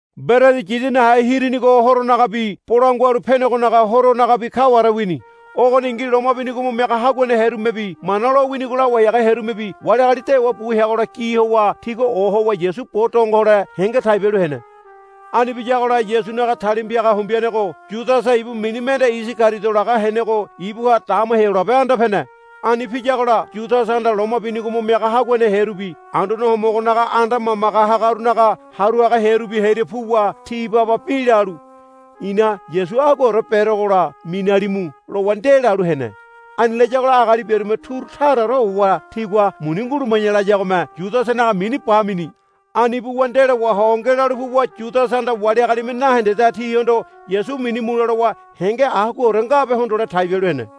Mberedi Yidi Nahe Hirinigo Horonagabi Bolangua Halu Penegonaga Horonagabi kaware wini. Ogoningi loma binigo mo miaga haguane hearumebi Mana lowinigo lawai haga hearumebi wali agali dewa bu heagola gi howa tigua ohowa Yasu bo donge hole henge tai bialu hene. Ani biyagola Yasunaga talima piaga hombeanego Yudasa ibu mini mende Isagariodo laga henego ibuha dama Heyolabe anda pene. Ani piyagola Yudasahanda loma binigo mo miaga haguane hearubi Anduane Homogonaga anda mamage hagarunaga haru haga hearubi hearia puwa ti baba bi lalu, I̱na Yasu aguaore berogola minalimu, lowa ndelalu hene. Ani layagola agali biarume turu taraore howa tigua, Muni nguluma̱ya, layagome Yudasanaga mini bamini. Ani buwa ndelo waho ngelalu puwa Yudasahanda wali agalime nahendedaha tihondo Yasu minu mule lowa henge aguaore ngabe hondole tai bialu hene.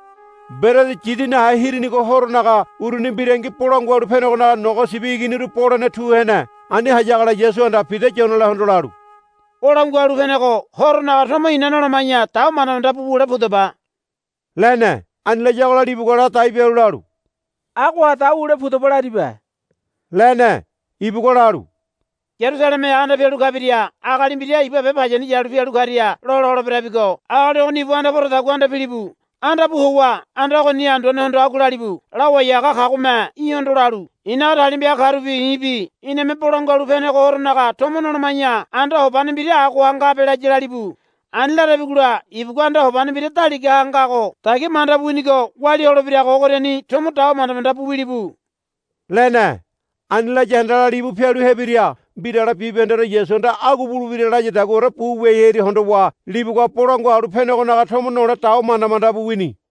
Mberedi Yidi Nahe Hirinigo Horonaga uruni mbirangi Bolangua Halu Penegonaga nogo sibi iginiru bolene tu hene. Ani hayagola Yasuhanda Pida Yonelahondo lalu, Bolangua Halu Penego Horonaga tomo ina noloma̱ya dawa manda manda bu wule pudaba, lene. Ani layagola libugua ladai bialu lalu, Agoha dawa wule pudaba laribe, lene. Ibugua lalu, Yarusalemeha anda pialu kabiria agali mbira iba be payani yalu pialu karia lola holeberabigo agali ogoni ibu anda poradagua anda pilibu. Anda pu howa anda ogoni anduanehondo agua lalibu, Lawai haga kagome í̠hondo lalu, I̱naga talima piaga karubi i̱bi iname Bolangua Halu Penego Horonaga tomo noloma̱ya anda hobane mbira agoha ngabe, laya lalibu. Ani larabigola ibugua anda hobane mbira daligaha ngago dagia manda bu winigo walia holebirago ogoriani tomo dawa manda manda bu wilibu, lene. Ani laya handala libu pialu hebiria mbirale bibahendeore Yasuhanda agua bulebira layadaguaore bu wiai hearia hondowa libugua Bolangua Halu Penegonaga tomo nole dawa manda manda bu wini.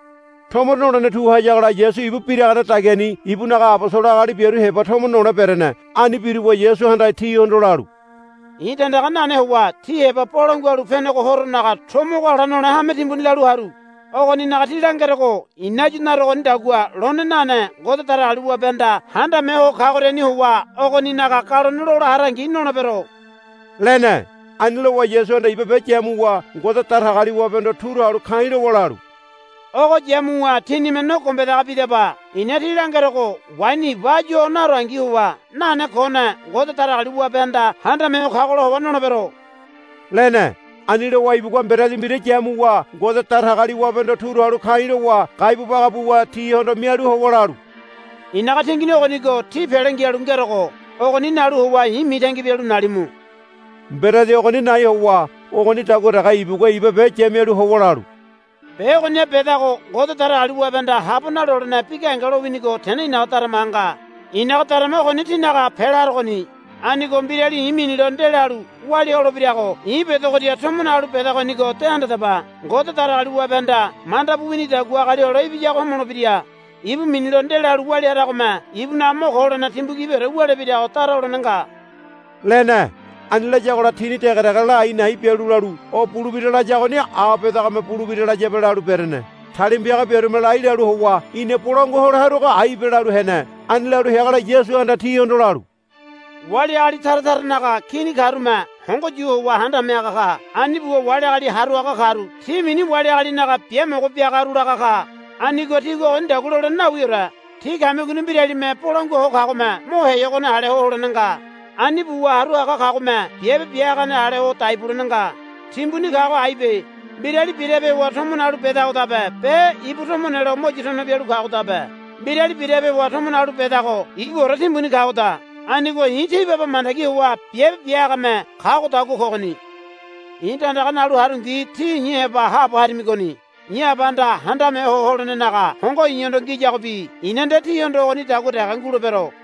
Tomo nolene tu hayagola Yasu ibu biragane dagiani ibunaga abosolo agali biaru heba tomo nole berene. Ani biruwa Yasuhanda tihondo lalu, I̱ tandaga nane howa tí heba Bolangua Halu Penego Horonaga tomo ogo ala nole hame timbuni lalu haru. Ogoninaga tí langerogo i̱na áyu narogonidagua lone nane Ngode Datagaliwabehanda Handame Ho Kagoriani howa ogoninaga galone lola harangi nolebero, lene. Ani lowa Yasuhanda iba be yamuwa Ngode Datagaliwabehondo turu halu ka̱i̱ lowa lalu, Ogo yamuwa tínime no gombedaga bidaba. I̱na tí langerogo waini iba áyu o narongi howa nane kone Ngode Datagaliwabehanda Handame Ho Kagola howa nolebero, lene. Ani lowa ibugua mberedi mbira yamuwa Ngode Datagaliwabehondo turu halu ka̱i̱ lowa gaibu baga buwa tihondo mialu howa lalu, I̱naga tingini ogonigo tí pele ngialu ngerogo. Ogoni nalu howa i̱ mitangi bialu nalimu. Mberedi ogoni nai howa ogonidagua dege ibugua iba be yamialu howa lalu, Be ogoniha bedago Ngode Datagaliwabehanda habo nalolene bi gahenge lowinigo tene i̱naga daramaha nga. I̱naga darama ogoni tínaga pela harogoni. Anigo mbirali i̱ minilo ndelalu walia holebirago i̱ bedogoria tomo nalu bedagonigo de handadaba. Ngode Datagaliwabehanda manda bu winidagua Agali Hole Ibiyago homolebira. Ibu minilo ndelalu walia haragome ibunaga mo ko holene timbu gibiore wulebirago dara holene nga, lene. Ani layagola tini dege dege la a̱i̱ na̱i̱ bialu lalu, O bulebira layagoni a bedagome bulebira layabe, lalu berene. Talima piaga biarume lai lalu howa, Ina bolangua hole haruago aibe, lalu hene. Ani lalu heagola Yasuhanda tihondo lalu, Wali agali tara taranaga kini karume hongo yu howa handame haga ka. Ani buwa wali agali haru haga karu ti mini Wali Agalinaga Biamogo Biagaru laga ka. Anigo tígua ogonidagua holene nawiore. Tí kamigoni mbiralime bolangua ho kagome mo heyogone ale ho holene nga. Ani buwa haru haga kagome biabe bia hagane ale ho dai bulene nga. Timbuni kago aibe. Mbirali birape howa tomo nalu bedagodabe be ibu tomo nelo mo yu tono bialu kagodabe. Mbirali birape howa tomo nalu bedago ibuore timbuni kagoda. Anigo i̱ tí baba mandagi howa biabe bia hagame kagodagua kogoni. I̱ tandaga nalu harungi tí i̱ heba haabo harimigoni. I̱ Abahanda handame ho holenenaga hongo i̱hondo ngiyagobi i̱na nde tíhondo ogonidagua dege ngulebero.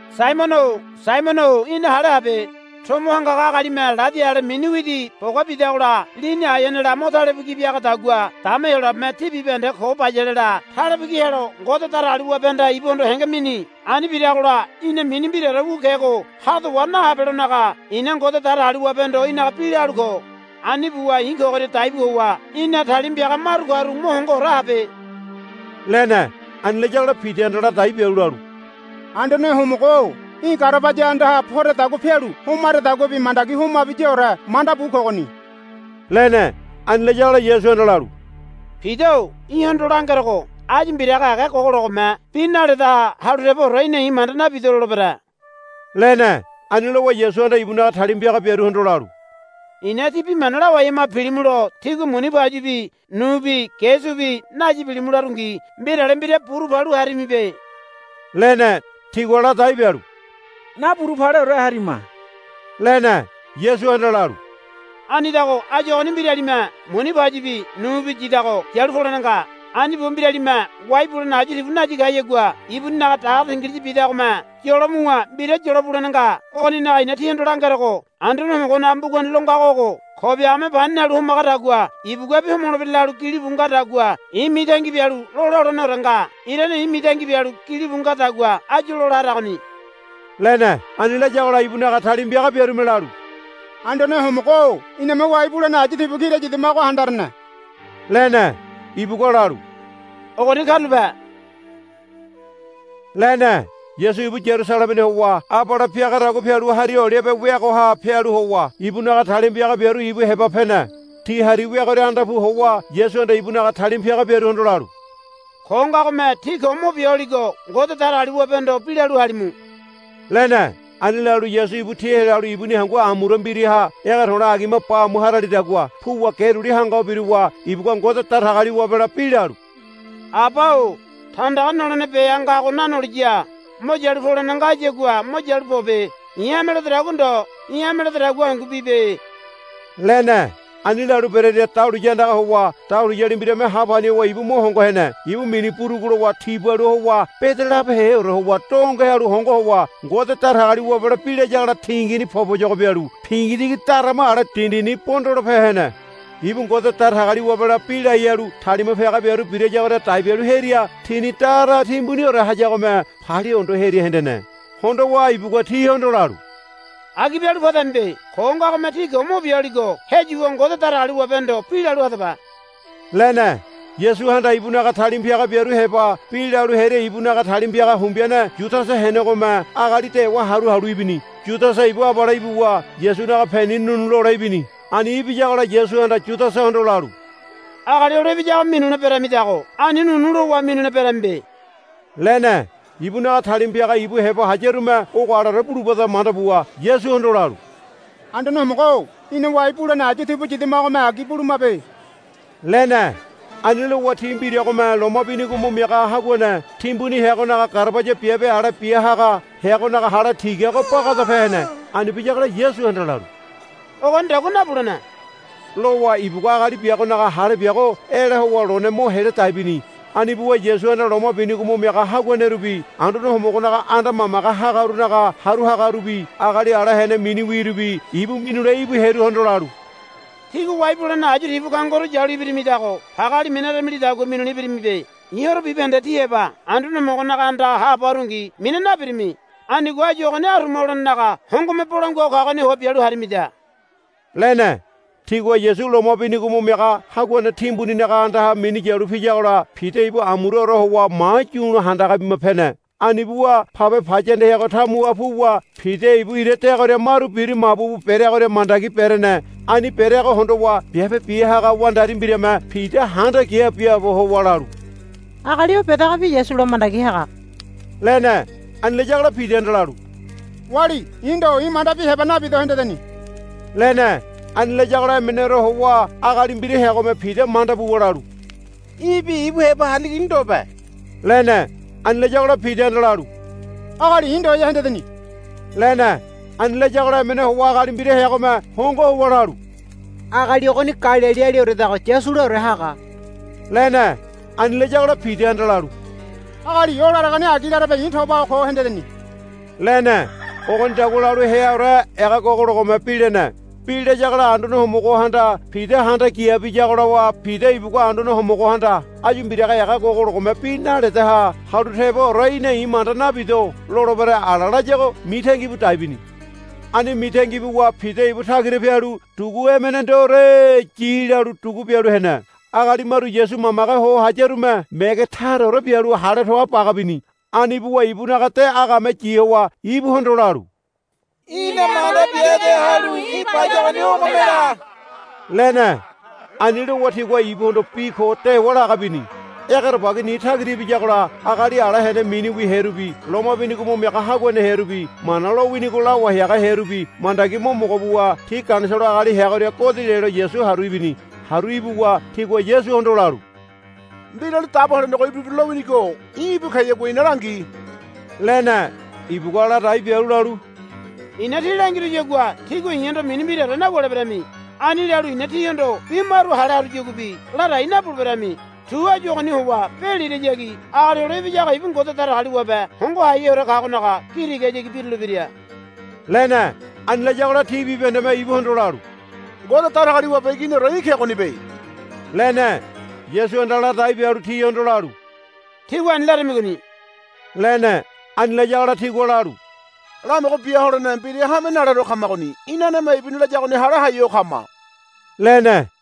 Saimono-o Saimono-o í̠na hale habe. Tomo hangaga agalime ladi ale mini widi bogabidagola lini aeanela mo talebu ki biagadagua dama Heyolabeme tí bibahende ko bayalela talebu ki helo Ngode Datagaliwabehanda ibuhondo henge mini. Ani biragola í̠na mini mbiraore wu kego hado wa nahabelonaga i̱na Ngode Datagaliwabehondo í̠naga bi la halu ko. Ani buwa i̱ kogoria daibu howa í̠na talima piaga maru karu mo hongoore habe, lene. Ani layagola Pidahanda ladai bialu lalu, Anduane Homogo-o í̠ garabaya andaha poredagua pialu homaredaguabi mandagi homabiyaore manda bu kogoni, lene. Ani layagola Yasuhanda lalu, Pida-o í̠hondo langerogo áyu mbiraga ega gogologome bi naledaha halu teboore í̠na i̱ manda nabido lolebere, lene. Ani lowa Yasuhanda ibunaga talima piaga biaruhondo lalu, I̱na tí bi mana lawai hama pilimulo tígua muni pauyibi nubi ge subi nayi pilimu larungi mbirale mbira buru palu harimibe, lene. Tigua ladai bialu, Naburu paleore harima, lene. Yasuhanda lalu, Anidago áyu ogoni mbiralime muni pauyibi nubi yidago yalu polene nga. Ani buwa mbiralime wai bulene ayu tibu nayi kayagua ibuninaga dagare tingiliya bidagome yolo muwa mbira yolo bulene nga. Ogoninaga i̱na tíhondo langerogo Anduane Homogonaga mbugani lo ngago ogo, Ko biagame pani nalu homagadagua ibuguabi homolebira, lalu gilibu ngadagua i̱ mitangi bialu lola holeneore nga. Irane i̱ mitangi bialu bi gilibu ngadagua áyu lola haragoni, lene. Ani layagola ibunaga talima piaga biarume lalu, Anduane Homogo-o iname wai bulene ayu tibu kira yidamago handarene, lene. Ibugua lalu, Ogoni karulape, lene. Yasu ibu Yarusalemeni howa abale piagadagua pialu Hari Olibe weagoha pialu howa ibunaga talima piaga biaru ibu heba pene. Ti hari weagoria anda pu howa Yasuhanda ibunaga talima piaga biaruhondo lalu, Ko ngagome tí ko mo bia holigo Ngode Datagaliwabehondo bi lalu halimu, lene. Ani lalu Yasu ibu ti helalu ibuni hangu amura mbiraha ege to̱le̱ agima ba amu haralidagua puwa ge duli hanga ho biruwa ibugua Ngode Datagaliwabela bi lalu, Aba-o tandaga nolene beha ngago nanoliya mo yalu polene ngayagua mo yalu pobe. I̱ hame ledodagua ndo í̠ hame lededagua hangu bibe, lene. Ani lalu berearia dahuliya andaga howa dahuliyali mbirame ha pani howa ibu mo hongo hene. Ibu mini burugu lowa tibalua howa bede labeheore howa donge halu hongo howa Ngode Datagaliwabela bi layagola tingini poboyogo bialu pingitigi darama ale dindini bondolope hene. Ibu Ngode Datagaliwabela bi lai halu talima piaga biaru birayagoria dai bialu hearia tini dara timbuniore hayagome palia hondo hearia hendene. Hondowa ibugua tihondo lalu, Agi bialu padamibe. Ko ngagome tí ko mo bia holigo heyuwa Ngode Datagaliwabehondo bi lalu hadaba, lene. Yasuhanda ibunaga talima piaga biaru heba bi lalu hearia ibunaga talima piaga hombeane Yudasa henegome agali dewa haru halu ibini. Yudasa ibu abale ibuwa Yasunaga peni nu̱nu̱ lole ibini. Ani ibiyagola Yasuhanda Yudasahondo lalu, Agali Hole Ibiyago minule beramidago ani nu̱nu̱ lowa minule beramibe, lene. Ibunaga talima piaga ibu heba hayarume ogo aleore bulubada manda buwa Yasuhondo lalu, Anduane Homogo-o ina wai bulene ayu tibu yidamagome agi bulumabe, lene. Ani lowa ti mbiragome loma binigo mo miaga haguane timbuni heagonaga garabaya biabe ale bia haga heagonaga hale tigago bagadape hene. Ani biyagola Yasuhanda lalu, Ogonidagua nabulene, lowa ibugua agali biagonaga hale biago ela howa lone mo heladai bini. Ani buwa Yasuhanda loma binigo mo miaga haguanerubi Anduane Homogonaga anda mamage hagarunaga haru hagarubi agali ala hene miniwirubi ibu minule íbu hearuhondo lalu, Tígua wai bulene ayu tibu kangoru yalu ibirimidago pageali minaramilidagua minule ibirimibe. I̱ horo bibahende tí heba Anduane Homogonaga andaha haabo harungi mina nabirimi. Anigo áyu ogoni aruma holenenaga hongome bolangua ho kagoni howa bialu harimida, lene. Tigua Yasu loma binigo mo miaga haguane timbuninaga andaha minu yalu piyagola Pida ibu amuraore howa mayu̱lo handaga bima pene. Ani buwa pabe payanda heago tamuha anda puwa Pida ibu ira deagoria maru bira mabu bu bereagoria mandagi berene. Ani bereago hondowa biabe bia haga wandari mbirame Pida handa kia biaabo howa lalu, Agali o bedagobi Yasula mandagi haga, lene. Ani layagola Pidahanda lalu, Wali i̱ ndo. I̱ mandabi heba nabido hendeni, lene. Ani layagola emeneore howa agali mbira heagome Pida manda buwa lalu, Í̠bi ibu heba hariligoni ndobe, lene. Ani layagola Pidahanda lalu, Agali i̱ ndoya hendeni, lene. Ani layagola emene howa agali mbira heagome hongo howa lalu, Agali ogoni Galilialioredago Yasulaore haga, lene. Ani layagola Pidahanda lalu, Agali o laregoni agi larebe i̱ tobaho ko hendeni, lene. Ogonidagua lalu heaore ega gogologome bi lene. Bi layagola Anduane Homogohanda Pida handa kia biyagola Pida ibugua Anduane Homogohanda, Áyu mbiraga ega gogologome bi naledaha halu teboore í̠na i̱ manda nabido lolebere, ala layago mitangi bu dai bini. Ani mitangi buwa Pida ibu tagira pialu dugu emene ndoore yi lalu dugu bialu hene. Agali maru Yasu mamage ho hayarume mege taraore bialu hale to̱a̱ baga bini. Ani buwa ibunaga de agame yi howa ibuhondo lalu, Í̠na manda biade halu í̠ bayagoni ogome la, lene. Ani lowa tigua ibuhondo bi ko dewa laga bini. Egerebagi ni tagira ibiyagola agali ala hene miniwi hearubi loma binigo mo miaga haguane hearubi Mana lowinigo lawai haga hearubi mandagi mo mogo buwa ti Ganisolo agali heagoria godi lelo Yasu haru ibini. Haru ibuwa tigua Yasuhondo lalu, Mbirali Dabo Helenego ibulebira lowinigo í̠ ibu keyagua í̠na langi, lene. Ibugua ladai bialu lalu, I̱na tí langiruyagua tígua i̱hondo mini mbiraore nawuleberami. Ani lalu i̱na tíhondo bi maru hale haruyaguabi ladai nabuleberami. Tu áyu ogoni howa be lirayagi Agali Hole Ibiyago ibu Ngode Datagaliwabe Hongo Haiheore Kagonaga gi tigahayagi birulebira, lene. Ani layagola ti bibahendeme ibuhondo lalu, Ngode Datagaliwabe Iginiore í̠ kegonibe, lene. Yasuhanda ladai bialu tihondo lalu, Tígua ani larimigoni, lene. Ani layagola tigua lalu, Lamogo bia holene mbira hame naleore kamagoni. Inaneme ibuni layagoni hale hai ho kama, lene.